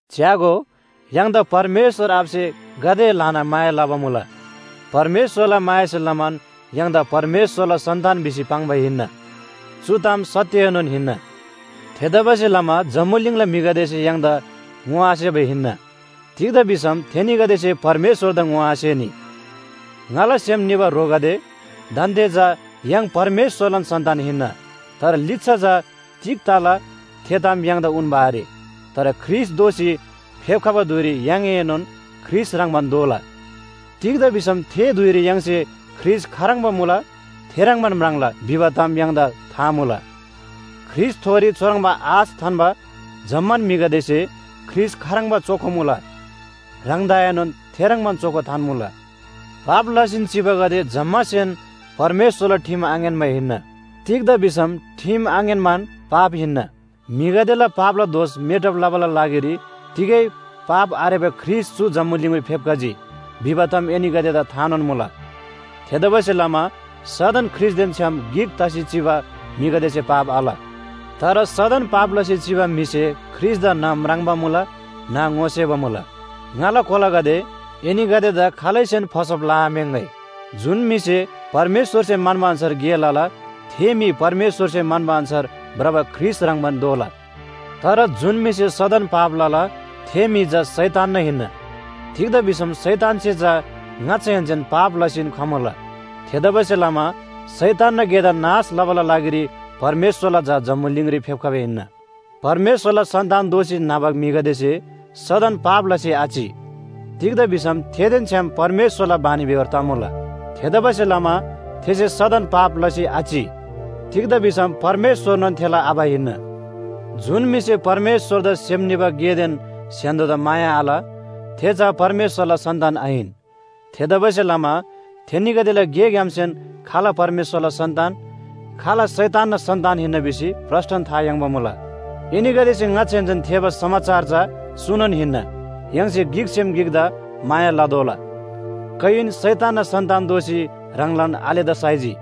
च्‍यागो, य्‍हाङदा परमेश्‍वर आबासे गाते ल्‍हाना माया लबा मुला। परमेश्‍वरला मायासे लमान य्‍हाङदा परमेश्‍वरला सन्‍तान भिसी पाङ्बा हिन्‍ना, चु ताम सत्‍यएनोन हिन्‍ना। थेतबासेलमा जम्‍बुलिङला म्‍हिगदेसे य्‍हाङदा ङोआसेबा हिन्‍ना, तिग्‍दा भिसम थेनीगदेसे परमेश्‍वरदा ङोआसेनी। ङाला सेम निबा ह्रोगदे, दान्‍दे चा य्‍हाङ परमेश्‍वरलान सन्‍तान हिन्‍ना। तर लिच्‍छा चा तिग तला थे ताम य्‍हाङदा उन्‍बा आरे। तर ख्रीष्‍ट दोःसी फेप्‍खबा धुइरी य्‍हाङएनोन ख्रीष्‍ट ह्रङ्‌बान दोला। तिग्‍दा भिसम थे धुइरी य्‍हाङसे ख्रीष्‍ट खाह्रङ्बा मुला थेह्रङ्बान म्राङ्ला भिबा ताम य्‍हाङदा था मुला। ख्रीष्‍टथोरी चुह्रङ्बा आश थान्‍बा जम्‍मान म्‍हिगदेसे ख्रीष्‍ट खाह्रङ्बा चोखो मुला, ह्राङदाएनोन थेह्रङ्बान चोखो थान्‍मुला। पाप लसीन चिबागदे जम्‍मासेन परमेश्‍वरला ठिम आङ्‌यान्‍बा हिन्‍ना। तिग्‍दा भिसम ठिम आङ्‌यान्‍बान पाप हिन्‍ना। म्‍हिगदेला पापला दोष मेटब लबाला लागिरी तिगै पाप आरेबा ख्रीष्‍ट चु जम्‍बुलिङरी फेप्‍खजी भिबा ताम एनीगदेदा थानोन मुला। थेतबासेलमा सदन ख्रीष्‍टदेन छ्‌याम गिक तसी चिबा म्‍हिगदेसे पाप आल। तर सदन पाप लसी चिबा म्‍हिसे ख्रीष्‍टदा न्‍ह म्राङ्बा मुला न्‍ह ङोसेबा मुला। ङाला कोलागदे, एनीगदेदा खालैसेन फसब लआम्‍याङ्‍गै। जुन म्‍हिसे परमेश्‍वरसे म्‍हन्‍बा अन्‍छार गे लला, थे म्‍हि परमेश्‍वरसे म्‍हन्‍बा अन्‍छार भ्रबा ख्रीष्‍ट ह्रङ्‌बान दोला। तर जुन म्‍हिसे सदन पाप लला, थे म्‍हि चा शैतानना हिन्‍ना। तिग्‍दा भिसम शैतानसे चा ङाच्‍छाहेन्‍सेन पाप लसीन खमुला। थेतबासेलमा शैतानना गेदा नाश लबाला लागिरी परमेश्‍वरला झा जम्‍बुलिङरी फेप्‍खबा हिन्‍ना। परमेश्‍वरला सन्‍तान दोःसी न्‍हबा म्‍हिगदेसे सदन पाप लसी आचि, तिग्‍दा भिसम थेदेन छ्‌याम परमेश्‍वरला बानीबेहोर तमुला। थेतबासेलमा थेसे सदन पाप लसी आचि, तिग्‍दा भिसम परमेश्‍वरनोन थेला आबा हिन्‍ना। जुन म्‍हिसे परमेश्‍वरदा सेम निबा गेदेन स्‍य्‍हान्‍दो‍दा माया आल, थे चा परमेश्‍वरला सन्‍तान आहिन। थेतबासेलमा थेनीगदेला गेग्‍यामसेन खाल परमेश्‍वरला सन्‍तान, खाल शैतानना सन्‍तान हिन्‍ना भिसी प्रस्‍टन था याङ्बा मुला। एनीगदेसे ङाच्‍छाहेन्‍सेन थेःबा समाचार चा चुनोन हिन्‍ना, “य्‍हाङसे गिकसेम गिकदा माया लतोःला।” कयिन शैतानना सन्‍तान दोसी ह्राङलान आलेदा साइजी।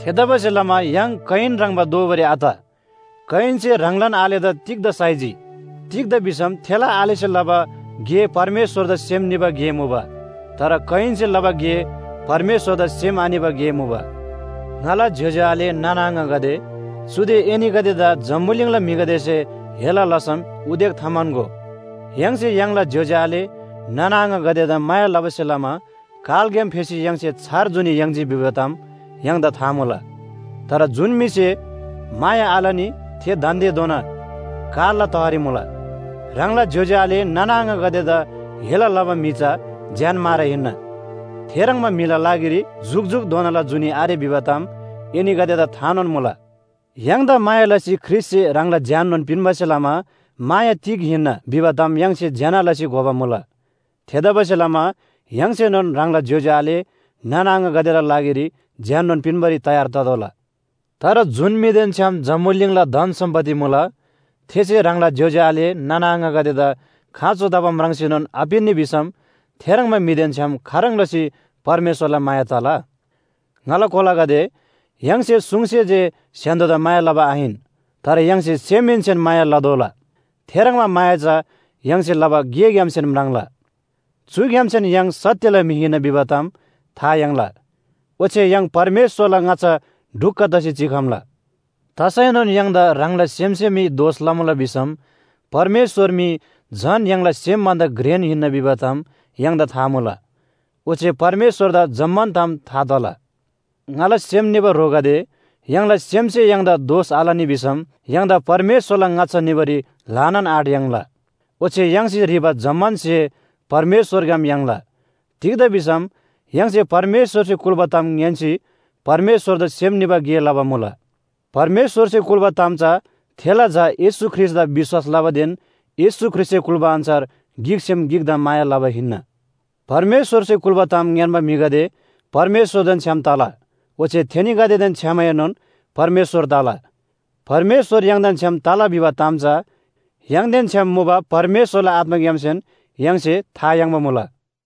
थेतबासेलमा य्‍हाङ कयिन ह्रङ्‌बा दोबारी आत। कयिनसे ह्राङलान आलेदा तिग्‍दा साइजी? तिग्‍दा भिसम थेला आलेसे लबा गे परमेश्‍वरदा सेम निबा गे मुबा, तर कयिनसे लबा गे परमेश्‍वरदा सेम आनिबा गे मुबा। ङाला ज्‍योज्‍यो आले नाना आङागदे, चुदे एनीगदेदा जम्‍बुलिङला म्‍हिगदेसे हेला लसम उदेक थाम्‍हन्‍गो। य्‍हाङसे य्‍हाङला ज्‍योज्‍यो आले नाना आङागदेदा माया लबासे लमा कालग्‍याम फेसी य्‍हाङसे छार जुनी याङ्जी भिबा ताम य्‍हाङदा था मुला। तर जुन म्‍हिसे माया आलनी थे दान्‍देधोना कालला तहरी मुला। ह्राङला ज्‍योज्‍यो आले नाना आङागदेदा हेला लबा म्‍हि चा ज्‍यानमारा हिन्‍ना। थेह्रङ्बा म्‍हिला लागिरी जुकजुकधोनाला जुनी आरे भिबा ताम एनीगदेदा थानोन मुला। य्‍हाङदा माया लसी ख्रीष्‍टसे ह्राङला ज्‍याननोन पिन्‍बासे लमा माया तिग हिन्‍ना भिबा ताम य्‍हाङसे ज्‍यना लसी घोबा मुला। थेतबासेलमा य्‍हाङसेनोन ह्राङला ज्‍योज्‍यो आले नाना आङागदेला लागिरी ज्‍याननोन पिन्‍बारी तयार ततोःला। तर जुन म्‍हिदेन छ्‌याम जम्‍बुलिङला धन सम्‍पत्ति मुला, थेसे ह्राङला ज्‍योज्‍यो आले नाना आङागदेदा खाँचो तबा म्राङ्सीनोन आपिन्‍नी भिसम थेह्रङ्बा म्‍हिदेन छ्‌याम खाह्रङ् लसी परमेश्‍वरला माया तला? ङाला कोलागदे, य्‍हाङसे सुङसे जे स्‍य्‍हान्‍दो‍दा माया लबा आहिन, तर य्‍हाङसे सेमहेन्‍सेन माया लतोःला। थेह्रङ्बा माया चा य्‍हाङसे लबा गेग्‍यामसेन म्राङ्ला। चुग्‍यामसेन य्‍हाङ सत्‍यला म्‍हि हिन्‍ना भिबा ताम था याङ्ला। ओच्‍छे य्‍हाङ परमेश्‍वरला ङाच्‍छा ढुक्‍क तसी चिखम्‍ला। तसैनोन य्‍हाङदा ह्राङला सेमसे मी दोष लमुला भिसम परमेश्‍वर मी झन य्‍हाङला सेम भन्‍दा घ्रेन हिन्‍ना भिबा ताम य्‍हाङदा था मुला। ओच्‍छे परमेश्‍वरदा जम्‍मान ताम था तला। ङाला सेम निबा ह्रोगदे, य्‍हाङला सेमसे य्‍हाङदा दोष आलनी भिसम य्‍हाङदा परमेश्‍वरला ङाच्‍छा निबारी ल्‍हानान आँट याङ्ला। ओच्‍छे य्‍हाङसे ह्रीबा जम्‍मान स्‍हे परमेश्‍वरग्‍याम याङ्ला। तिग्‍दा भिसम य्‍हाङसे परमेश्‍वरसे कुल्‍बा ताम ङ्‌यान्‍सी परमेश्‍वरदा सेम निबा गे लबा मुला। परमेश्‍वरसे कुल्‍बा ताम चा थेला झा येशू ख्रीष्‍टदा विश्‍वास लबादेन येशू ख्रीष्‍टसे कुल्‍बा अन्‍छार गिकसेम गिकदा माया लबा हिन्‍ना। परमेश्‍वरसे कुल्‍बा ताम ङ्‌यान्‍बा म्‍हिगदे परमेश्‍वरदेन छ्‌याम तला, ओच्‍छे थेनीगदेदेन छ्‌यामएनोन परमेश्‍वर तला। परमेश्‍वर य्‍हाङदेन छ्‌याम तला भिबा ताम चा य्‍हाङदेन छ्‌याम मुबा परमेश्‍वरला आत्‍माग्‍यामसेन य्‍हाङसे था याङ्बा मुला।